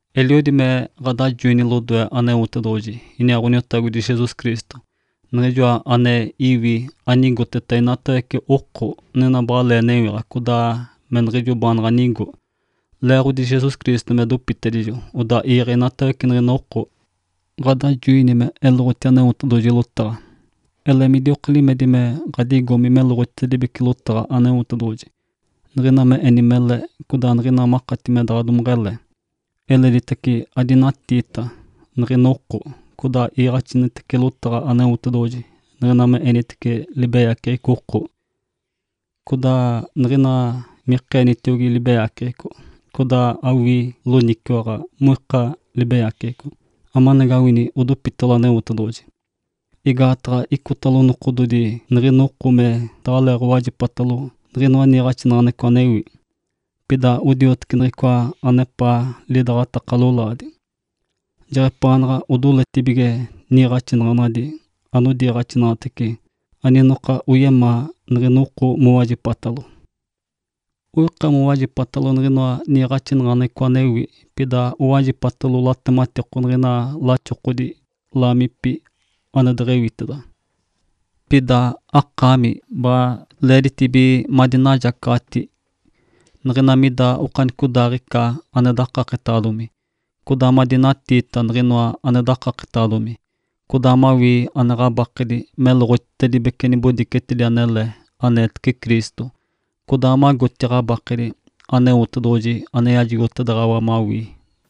Eliodi me ɡ̶adajoini lodoe Aneotedoɡ̶oji iniaa Ǥoniotagodi Jesus Cristo, Niɡ̶ijoa ane iwi anigoteta inatawece oko, niɡ̶ina baɡ̶alee newiɡ̶a codaa me niɡ̶ijo baanaɡ̶a nigo. Leeɡ̶odi Jesus Cristo me dopitedijo odaa iiɡ̶e inatawece niɡ̶ina oko, ɡ̶adajoini me eloɡ̶oti Aneotedoɡ̶oji lotaɡ̶a. Ele midioka limedi me ɡ̶adigomi meloɡ̶otitedibece lotaɡ̶a Aneotedoɡ̶oji, niɡ̶ina me eni mele, codaa niɡ̶ina makati me daɡ̶a domeɡ̶ele. Eleditace, adinatiita niɡ̶ina oko, codaa iiɡ̶axinitece lotaɡ̶a Aneotedoɡ̶oji niɡ̶ina me enitece libeyaceɡ̶eco oko, codaa niɡ̶ina mikeenitiogi libeyaceɡ̶eco, codaa awii loniciwaɡ̶a moika libeyaceɡ̶eco, amanagawini odopitalo Aneotedoɡ̶oji. Igaataɡ̶a icotalo nokododi niɡ̶ina oko me daɡ̶aleeɡ̶owajipatalo niɡ̶inoa niiɡ̶axinaɡ̶aneɡ̶eco anewi. Pida odioteci niɡ̶ica anepaa lidaɡ̶ataka lolaadi. Jeɡ̶epaanaɡ̶a odoletibige niiɡ̶axinaɡ̶anadi anodiiɡ̶axinaɡ̶atece aninokina anoyemaa niɡ̶ina oko mowajipata. Oika mowajipata niɡ̶inoa niiɡ̶axinaɡ̶aneɡ̶eco anewi, pida owajipatalo latematiko niɡ̶inoa laxokodi laamipi ane deɡ̶ewiteda. Pida akaami baɡ̶a leeditibige madinajacaɡ̶ati niɡ̶ina mida okanicodaaɡ̶ica ane dakaketaɡ̶adomi, codaa madinatiita niɡ̶inoa ane dakaketaɡ̶adomi, codaa mawii ane ɡ̶abakedi meloɡ̶otitedibece nibodicetedi anele aneetece Cristo, codaa magoti ɡ̶abakedi Aneotedoɡ̶oji ane yajigotedaɡ̶awa mawii.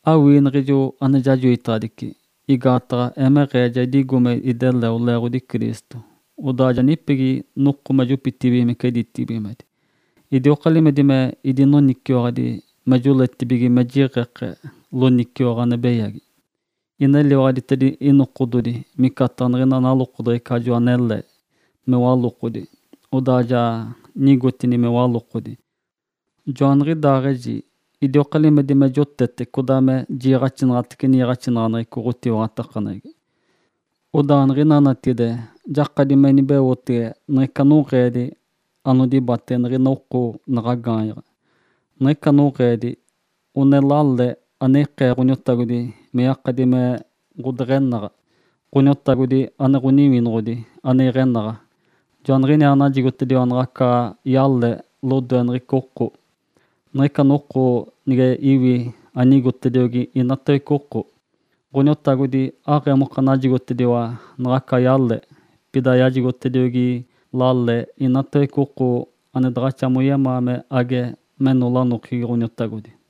Awii niɡ̶ijo ane jajoitaɡ̶adici, igaataɡ̶a emeɡ̶eeta ja idigo me ideleo leeɡ̶odi Cristo, codaa ja nipegi noko me jopitibigimece ditibigimedi. Idioka limedi me idinoniciwaɡ̶adi me joletibige me jiɡ̶eke loniciwaɡ̶a ane beyagi. Ineliwaɡ̶aditedini inokododi micataɡ̶a niɡ̶ina nalokodeɡ̶ecajo anele me walokodi, odaa ja nigotini me walokodi. Joaniɡ̶idaaɡ̶eji idioka limedi me jotete codaa me jiiɡ̶axinaɡ̶atece niiɡ̶axinaɡ̶aneɡ̶eco ɡ̶otiwaɡ̶atakaneɡ̶egi. Odaa niɡ̶ina natigide jakadi me inibeotege niɡ̶ica noɡ̶eedi anodibatege niɡ̶ina oko naɡ̶a gaanyaɡ̶a. Niɡ̶ica ɡ̶onoɡ̶eedi one ɡ̶odale ane ikee Ǥoniotagodi me yakadi me ɡ̶odeɡ̶enaɡ̶a. Ǥoniotagodi ane Ǥoniwinoɡ̶odi ane iɡ̶enaɡ̶a, Joaniɡ̶iniaa najigotediwa naɡ̶aca yale lodoe niɡ̶ica oko, niɡ̶ica noko nige iwi anigotediogi inatawece oko. Ǥoniotagodi aɡ̶emoka najigotediwa naɡ̶aca yale, pida yajigotediogi lale inatawece oko ane daɡ̶axa moyemaa me age meno lanokegi Ǥoniotagodi.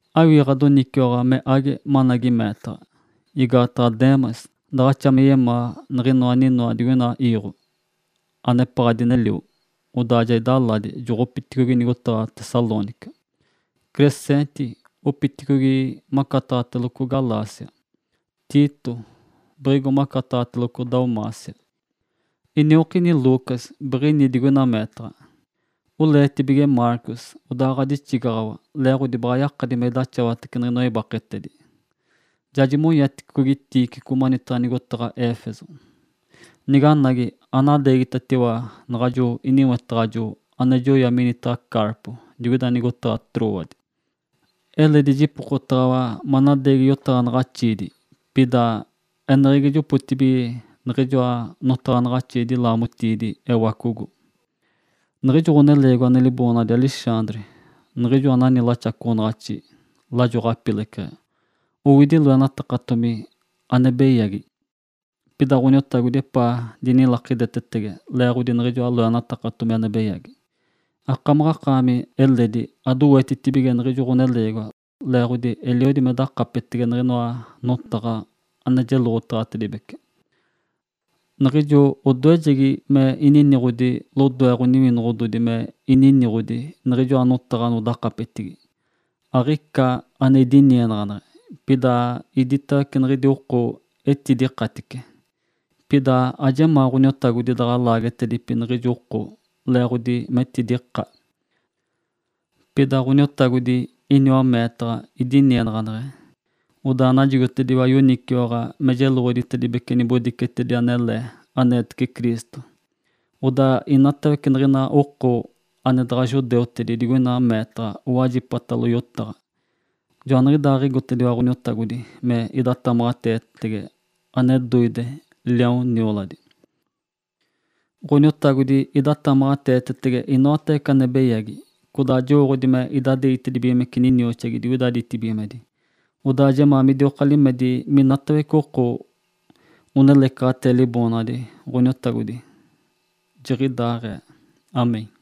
Awii ɡ̶adoniciwaɡ̶a me age managi meetaɡ̶a. Igaataɡ̶a Demas daɡ̶axa me yemaa niɡ̶inoa aninoa digoina iiɡ̶o, anepaɡ̶a dinelio, odaa ja idaladi, joɡ̶opiticogi nigotaɡ̶a Tessalônica. Crescente boɡ̶opiticogi macataɡ̶ateloco Galácia, Tito biɡ̶igo macataɡ̶ateloco Dalmácia. Iniokini Lucas biɡ̶ini digoina meetaɡ̶a. Oleetibige Marcos, odaa ɡ̶adixigaɡ̶awa leeɡ̶odi baɡ̶a yakadi me idaxawatece niɡ̶inoa ibaketedi. Ja jimonyaticogi Tíquico manitaɡ̶a nigotaɡ̶a Éfeso. Niganagi, anadeegitatiwa naɡ̶ajo iniwetaɡ̶ajo ane joya minitaɡ̶a Carpo digoida nigotaɡ̶a Trôade. Eledi jipokotaɡ̶awa manadeegi yotaɡ̶anaɡ̶axiidi, pida eneɡ̶egi jopotibige niɡ̶ijoa notaɡ̶anaɡ̶axiidi laamotiidi ewacogo. Niɡ̶ijo ɡ̶oneleegiwa ane liboonaɡ̶adi Alexandre niɡ̶ijo anani laxacoɡ̶onaɡ̶axi lajo ɡ̶apileceɡ̶e, owidi loenatakatomi ane beyagi. Pida Ǥoniotagodi epaa dinilakidetetege leeɡ̶odi niɡ̶ijoa loenatakatomi ane beyagi. Akaami eledi adowetitibige niɡ̶ijo ɡ̶oneleegiwa, leeɡ̶odi eliodi me dakapetege niɡ̶inoa notaɡ̶a ane jeloɡ̶otaɡ̶atedibece. Niɡ̶ijo odoejegi me idinikee lodoe ɡ̶oniwinoɡ̶odi me ininiɡ̶odi niɡ̶ijoa notaɡ̶a anodakapetigi, aɡ̶ica ane idinienaɡ̶aneɡ̶e, pida iditawece niɡ̶idi oko etidikatice. Pida ajemaa Ǥoniotagodi daɡ̶a laagetedipi niɡ̶ijo oko leeɡ̶odi metidika. Pida Ǥoniotagodi iniwa meetaɡ̶a, idinienaɡ̶aneɡ̶e, odaa najigotediwa yoniciwaɡ̶a me jeloɡ̶odi nibodicetedi anele aneetece Cristo. Odaa inatawece niɡ̶ina oko ane daɡ̶a judeutedi digoina meetaɡ̶a owajipatalo yotaɡ̶a. Joaniɡ̶idaaɡ̶igotediwa Ǥoniotagodi me idatamaɡ̶ateetetege ane doide, liaon nioladi. Ǥoniotagodi idatamaɡ̶ateetetege inoatawece ane beyagi, codaa jowooɡ̶odi me idadeegitedibigimece ninioxadi digoida ditibigimedi. Odaa jemaa midioka limedi minatawece oko onelecaɡ̶atee Liboonaɡ̶adi Ǥoniotagodi. Jiɡ̶idaaɡ̶ee (Amém).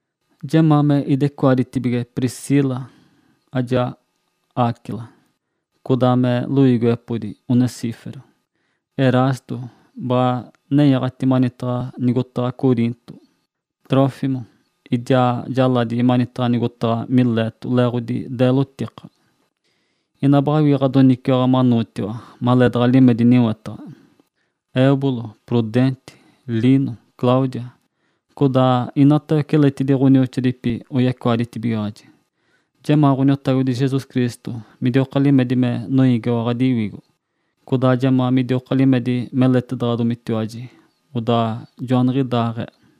Jemaa me idecoaditibige Priscila ijaa Áquila, codaa me loiigiwepodi Onesíforo. Erasto baɡ̶a nenyaɡ̶ati manitaɡ̶a nigotaɡ̶a Coriinto, Trófimo idiaa jaladite manitaɡ̶a nigotaɡ̶a Mileto leeɡ̶odi deelotika. Ina baɡ̶awii ɡ̶adoniciwaɡ̶a manootiwa maleedaɡ̶a limedi niwetaɡ̶a. Êubulo, Prudente, Lino, Cláudia, codaa inatawece eledi ɡ̶onioxoadipi oyecoaditibigaɡ̶aji. Jemaa Ǥoniotagodi Jesus Cristo midioka limedi me noiigiwa ɡ̶adiwigo. Codaa jemaa midioka limedi meletedaɡ̶adomitiwaji. Odaa joaniɡ̶idaaɡ̶ee.